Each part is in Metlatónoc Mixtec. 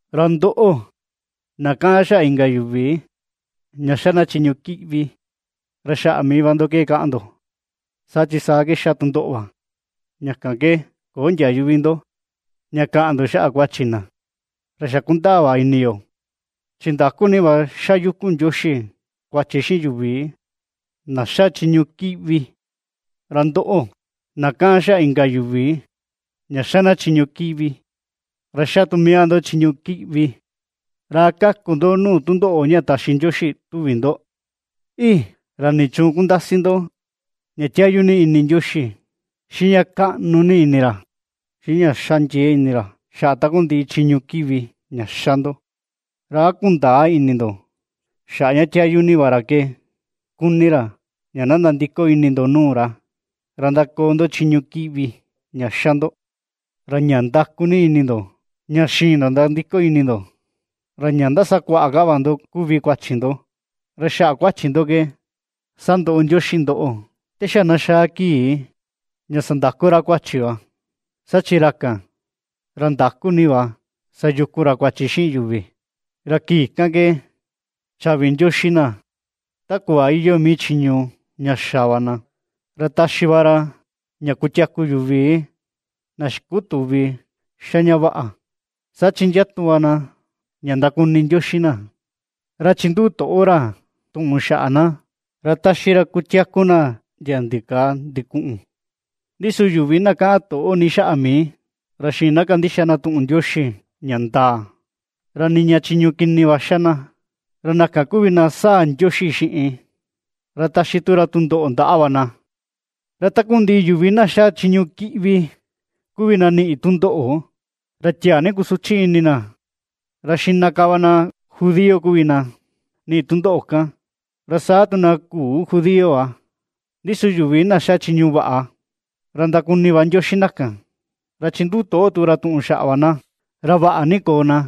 Ra ndoꞌo, na kaꞌan xaꞌa inka yuvi ña ^xa na chiñu kiꞌvi, ra xaꞌa mii va ndo ke kaꞌan ndo, saa chi saa ke ^xa tu ndoꞌo va, ña kan ke köo ndiayu vi ndo ña kaꞌan ndo xaꞌa kuachi na. Ra xa ^kundaa va ini yo, chi ndakú ni va xayukun Ndioxi kuachi xiꞌin yuvi na ^xa chiñu kíꞌvi. Ra ndoꞌo, na kaꞌan xaꞌa inka yuvi ña ^xa na chiñu kíꞌvi, ra ^xa tu mii va ndo chiñu kiꞌvi, ¿ra a kaku ndo nuu tundoꞌo ña taxi Ndioxi tuvi ndo? ¡Ii!, ¿ra nichuun kundasi ndo, ña tiayu ni ini Ndioxi, xiꞌin ña kaꞌnu ni ini ra, xiꞌin ña ^xa ndiee ini ra xaꞌa takundiꞌi chiñu kiꞌvi ña ^xa ndo? ¿Ra a kundäa ini ndo xaꞌa ña tiayu ni va ra ke kuni ra ña na nandiko ini ndo nuu ra, ndakoo ndo chiñu kiꞌvi ña xa ndo? Ra ña nda̱ku̱ ni ini ndo, ña xïin ndo nandiko ini ndo, ra ña ndasakuaꞌa ka va ndo kuvi kuachi ndo, ra xaꞌa kuachi ndo ke sandoꞌo Ndioxi ndoꞌo, te xa na xaa kii ña sandaku ra kuachi va, saa chi ra kan, ra ndaku ni va sayukun ra kuachi xiꞌin yuvi. Ra kii kan ke, chaꞌvi Ndioxi na ta kuꞌva iyoo mii chiñu ña xa va na. Ra taxi va ra ña kutiaku yuvi na xikutüvi ^xa ña vaꞌa, saa chi ndiatu va na ña ndakuni Ndioxi na, ra chinduꞌu toꞌo ra tuꞌun xaꞌa na, ra taxi ra kutiaku na ndia ndikaa ndikuꞌun. Ndi su yuvi na kaꞌan toꞌo ni xaꞌa mii, ra xïin na kandixa na tuꞌun Ndioxi ña ndaa, ra niña chiñu kini va ^xa na, ra na kan kuvi na sáa̱ Ndioxi xiꞌin, ra taxi tu ra tundoꞌo ndaꞌa va. Ra takundiꞌi yuvi na xa chiñu kíꞌvi kuvi na niꞌi tundoꞌo, ra tiaa ni kusuchi ini na, ra xiꞌna ka va na judío kuvi na niꞌi tundoꞌo kan, ra saa tu na küu judío va. Ndi su yuvi na ^xa chiñu vaꞌa, ra ndakuni va Ndioxi na kan, ra chinduꞌu toꞌo tu ra tuꞌun xaꞌa va na, ra vaꞌa ni koo na;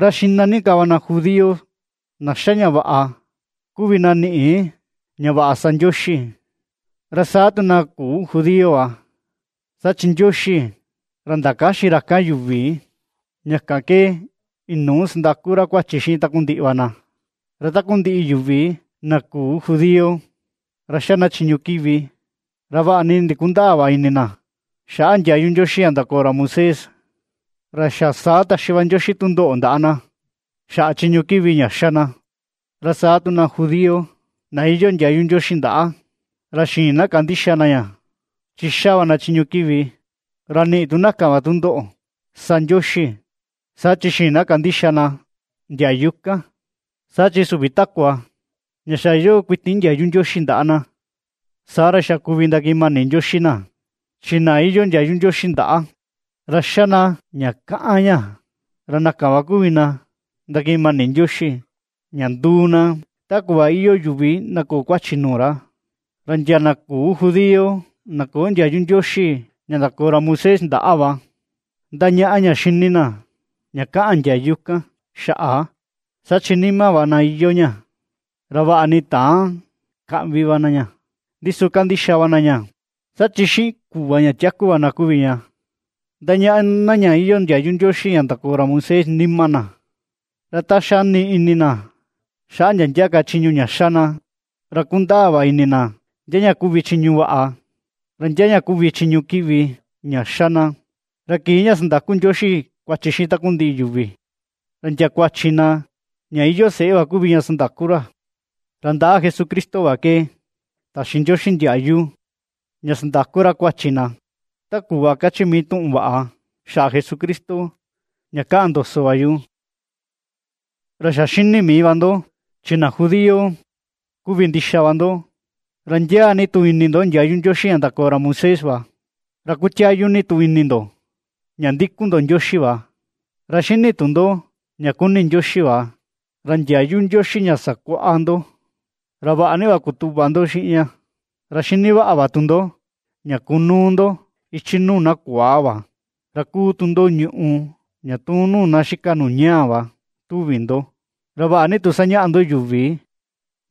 ra xiꞌna ni ka va na judío na ^xa ña vaꞌa kuvi na niꞌi ña vaꞌa sa Ndioxi, ra saa tu na küu judío va. Saa chi Ndioxi, ra ndakäxin ra kan yuvi, ña kan ke inuu sandaku ra kuachi xiꞌin takundiꞌi va na. Ra takundiꞌi yuvi na küu judío, ra ^xa na chiñu kiꞌvi, ra vaꞌa ni ndikundäa va ini na xaꞌa ndiayu Ndioxi ña ndakoo ra Moisés, ra xa saa taxi va Ndioxi tundoꞌo ndaꞌa na xaꞌa chiñu kiꞌvi ña ^xa na; ra saa tu na judío, na iyoo ndiayu Ndioxi ndaꞌa, ra xïin na kandixa na ña, chi ^xa va na chiñu kiꞌvi, ra niꞌi tu na kan va tundoꞌo sa Ndioxi, saa chi ^xïin na kandixa na ndiayu kan. Saa chi süvi takua ña xa iyoo kuiti ndiayu Ndioxi ndaꞌa na, saa ra xa kuvi ndakiꞌin mani Ndioxi na, chi na iyoo ndiayu Ndioxi ndaꞌa, ra xa na ña kaꞌan ña, ra na kan va kuvi na ndakiꞌin mani Ndioxi, ña nduu na ta kuꞌva iyoo yuvi na köo kuachi nuu ra. Ra ndia na küu judío na köo ndiayu Ndioxi ña ndakoo ra Moisés ndaꞌa va, ndañaꞌa ña xini na, ña kaꞌan ndiayu kan xaꞌa, saa chi nima va na iyoo ña, ra vaꞌa ni täan kaꞌvi na ña, ndi su kandixa va na ña. Saa chi xiꞌin kuꞌva ña tiaku va na kuvi ña, ndañaꞌa na ña iyoo ndiayu Ndioxi ña ndakoo ra Moisés nima na. Ra ta xani ini na xaꞌa ndia ndia ka chiñu ña ^xa na, ra kundaa va ini na, ndia ña kuvi chiñu vaꞌa, ra ndia ña kuvi chiñu kiꞌvi ña ^xa na. Ra kii ña sandaku Ndioxi kuachi xiꞌin takundiꞌi yuvi, ra ndia kuachi na ña iyoo seꞌe va kuvi sandaku ra, ra ndaꞌa Jesucristo va ke taxi Ndioxi ndiayu ña sandaku ra kuachi na, ta kuꞌva kachi mii tuꞌun vaꞌa xaꞌa Jesucristo, ña ^kaꞌan ndoso va yu. Ra xa xini mii va ndo, chi na judío kuvi ndixa va ndo, ra ndiaa ni tu ini ndo ndiayu Ndioxi ña ndakoo ra Moisés va, ra kutiayu ni tu ini ndo, ña ndikun ndo Ndioxi va. Ra xini tu ndo ña kuni Ndioxi va, ra ndiayu Ndioxi ña sakuaꞌa ndo, ra vaꞌa ni va kutuꞌva ndo xiꞌin ña. Ra xini vaꞌa tu ndo, ña kunuu ndo ichi nuu na kuaa va, ra ^kuu tu ndo ñùꞌù ña tuun nuu na xika nuu ñaa va tuvi ndo. Ra vaꞌa ni tu sañaꞌa ndo yuvi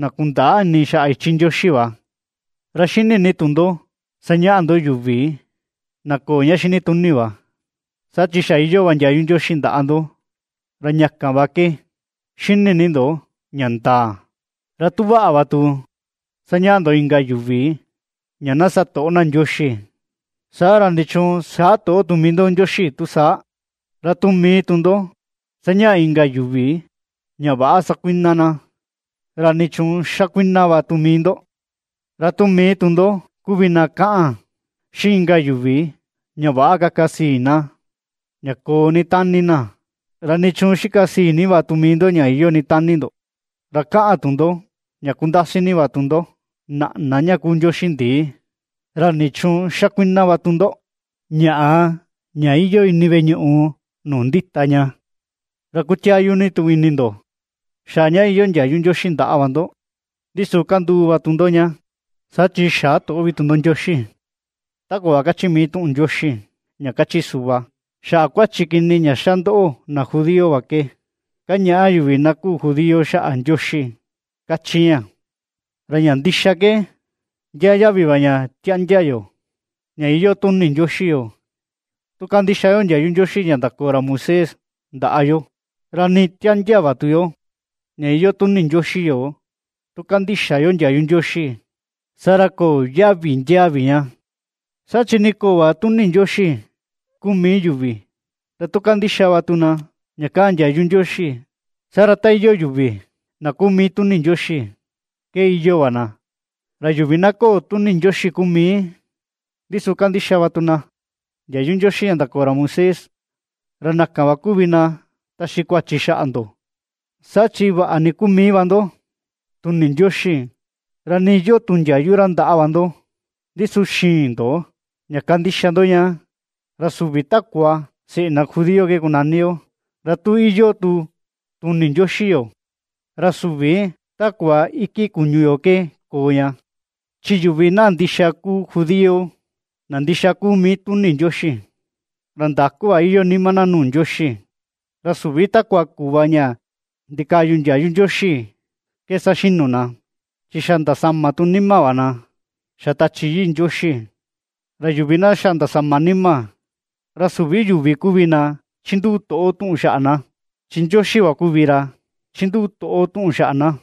na kundäa ini xaꞌa ichi Ndioxi va, ra xini ni tu ndo sañaꞌa ndo yuvi na köo ña xini tuni va, saa chi xa iyoo va ndiayu Ndioxi ndaꞌa ndo, ra ña kan va ke xini ni ndo ña ndaa. Ra tu vaꞌa va tu sañaꞌa ndo inka yuvi ña na sa toꞌo na Ndioxi, saa ra, ¿nichuun xä toꞌo tu mii ndo Ndioxi, tu saa? Ra tu mii tu ndo sañaꞌa inka yuvi ña väꞌa sa kuiꞌna na, ¿ra nichuun xa kuiꞌna va tu mii ndo? Ra tu mii tu ndo kuvi na ^kaꞌan xiꞌin inka yuvi ña väꞌa kaka sii na, ña koo ni tani na, ¿ra nichuun xika sii ni va tu mii ndo, ña iyoo ni tani ndo? Ra kaꞌan tu ndo ña kundasi ni va ndo naꞌna ña kuu ndioxi ndii, ¿ra nichuun xa kuiꞌna va tu ndo, ñaꞌa ña iyoo ini veꞌe ñuꞌu nuu ndita ña? Ra kutiayu ni tu ini ndo, xaꞌa ña iyoo ndiayu Ndioxi ndaꞌa va ndo, ndi su kanduu va tu ndo ña, saa chi xä toꞌo vi tu ndo Ndioxi. Ta kuꞌva kachi mii tuꞌun Ndioxi ña kachi suꞌva: “Xaꞌa kuachi kini ña ^xa ndoꞌo na judío va ke, kañaꞌa yuvi na küu judío xaꞌa Ndioxi”, kachi ña. Ra ña ndixa ke, ndiaa yaꞌvi va ña ^tiáꞌndiá yo, ña iyoo tuni Ndioxi yoo, tu kandixa yo ndiayu Ndioxi ña ndakoo ra Moisés ndaꞌa yo, ra nii tiáꞌndiá va tu yo, ña iyoo tuni Ndioxi yoo, tu kandïxa yo ndiayu Ndioxi, saa ra köo yaꞌvi ndiaa vi ña. Saa chi nii köo va tuni Ndioxi kuu mii yuvi, ra tu kandixa va tu na ña kaꞌan ndiayu Ndioxi, saa ra ta iyoo yuvi na kuu mii tuni Ndioxi ke iyoo va na. Ra yuvi na köo tuni Ndioxi kuu mii, ndi su kandixa va tu na ndiayu Ndioxi ña ndakoo ra Moisés, ra na kan va kuvi na taxi kuachi xaꞌa ndo, saa chi vaꞌa nii kuu mii va ndo tuni Ndioxi, ra nii iyoo tu ndiayu ra ndaꞌa va ndo, ndi su xïin ndo, ña kandixa ndo ña. Ra süvi takua seꞌe na judío ke kunani yo, ra tu iyoo tu tuni Ndioxi yoo, ra süvi takua iki kuñu yo ke koo ña. Chi yuvi na ndixa kuu judío, na ndixa kuu mii tuni Ndioxi, ra ndaku va iyoo nima na nuu Ndioxi. Ra süvi takua kuꞌva ña ndikaꞌyu ndiayu Ndioxi ke saxinu na, chi xa ndasama tu nima va na xa Tachi Yii Ndioxi. Ra yuvi na xa ndasama nima, ra süvi yuvi kuvi na ^chinduꞌu toꞌo tuꞌun xaꞌa na, chi Ndioxi va kuvi ra ^chinduꞌu toꞌo tuꞌun xaꞌa na.